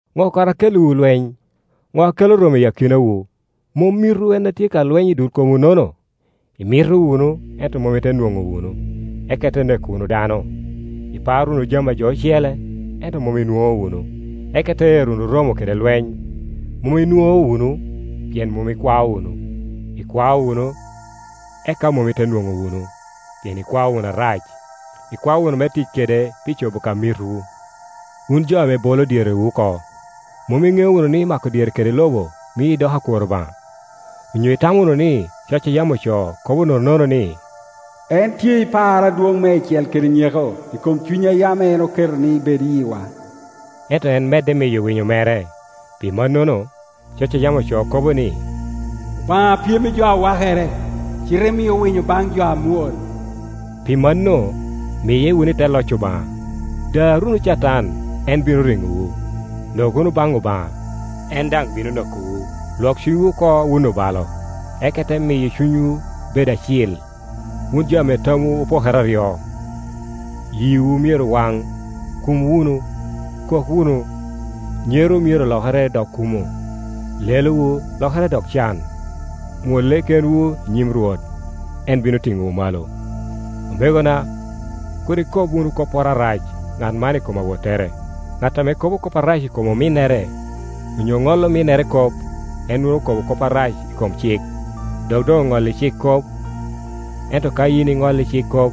Ŋo kara a kelliwu lweny? Ŋo a kelo romo i akinawu? Mom mitwu en a tye ka lweny i dul komwunono? Imito wunu, ento mom ite nwoŋo wunu, eka ite neko wunu dano. Iparo wunu jami a jo ocele, ento mom inwoŋo wunu, eka ite ero wunu romo kede lweny. Mom inwoŋo wunu, pien mom ikwao wunu. Ikwao wunu, eka mom ite nwoŋo wunu, pien ikwao wunu arac, ikwao wunu me tic kede pi cobo ka mitwu. Wun jo ame bolo dyerewu oko. Mom iŋeo wunu ni, mako dyere kede lobo mii idoko akwor Obaŋa? Onyo itamo wunu ni, coc a yam ocoo kobo nononono ni, “En tye i par adwoŋ meicel kede nyeko i kom cuny a yam en oketo ni bed i yiwa?” Ento en medde miyo winyo mere; pi mannono, coc a yam ocoo kobo ni, “Obaŋa pyem i jo a wakere, cite mio winyo baŋ jo amwol.” Pi mano, miye wunu i te loc Obaŋa. Dar wunu Catan, en bino riŋowu. Nok wunu baŋ Obaŋa, en daŋ bino nokowu. Lwok ciŋwu oko wun obalo, eka ite miyo cunywu bedo acil, wun jo ame tamwu opokere aryo. Yiwu myero waŋ, kum wunu, kok wunu. Nyerowu myero lokere dok kumo, lelowu lokere dok can. Mwolle kenwu i nyim Rwot, en bino tiŋowu malo. Omegona, kur ikob wunu kopporo arac, ŋat man i kom awottere. Ŋat ame kobo kop arac i kom ominnere, onyo ŋolo ominnere kop, en nwoŋo okobo kop arac i kom cik, dok doŋ oŋolli cik kop. Ento ka yin iŋolli cik kop,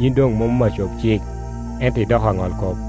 yin doŋ mom acob cik ento idoko aŋolkop.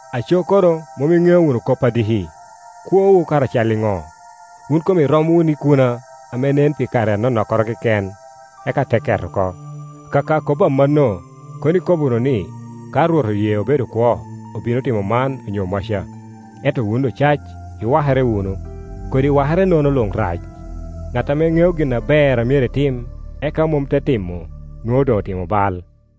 Aco kono mom iŋeo wunu kop a diki. Kwowu kara cal i ŋo? Wun kom irom wunu ikuna ame nen pi kare anonokkoro keken, eka te ket oko. Akaka kobo amanno, kono ikobo wunu ni, “Ka Rwot oye obedo kwo, obino timo man onyo maca.” Ento wun ocac, iwakere wunu. Kodi wakerenono luŋ rac, ŋat ame ŋeo gin aber a myero etim, eka mom te timo, nwoŋo doŋ otimo bal.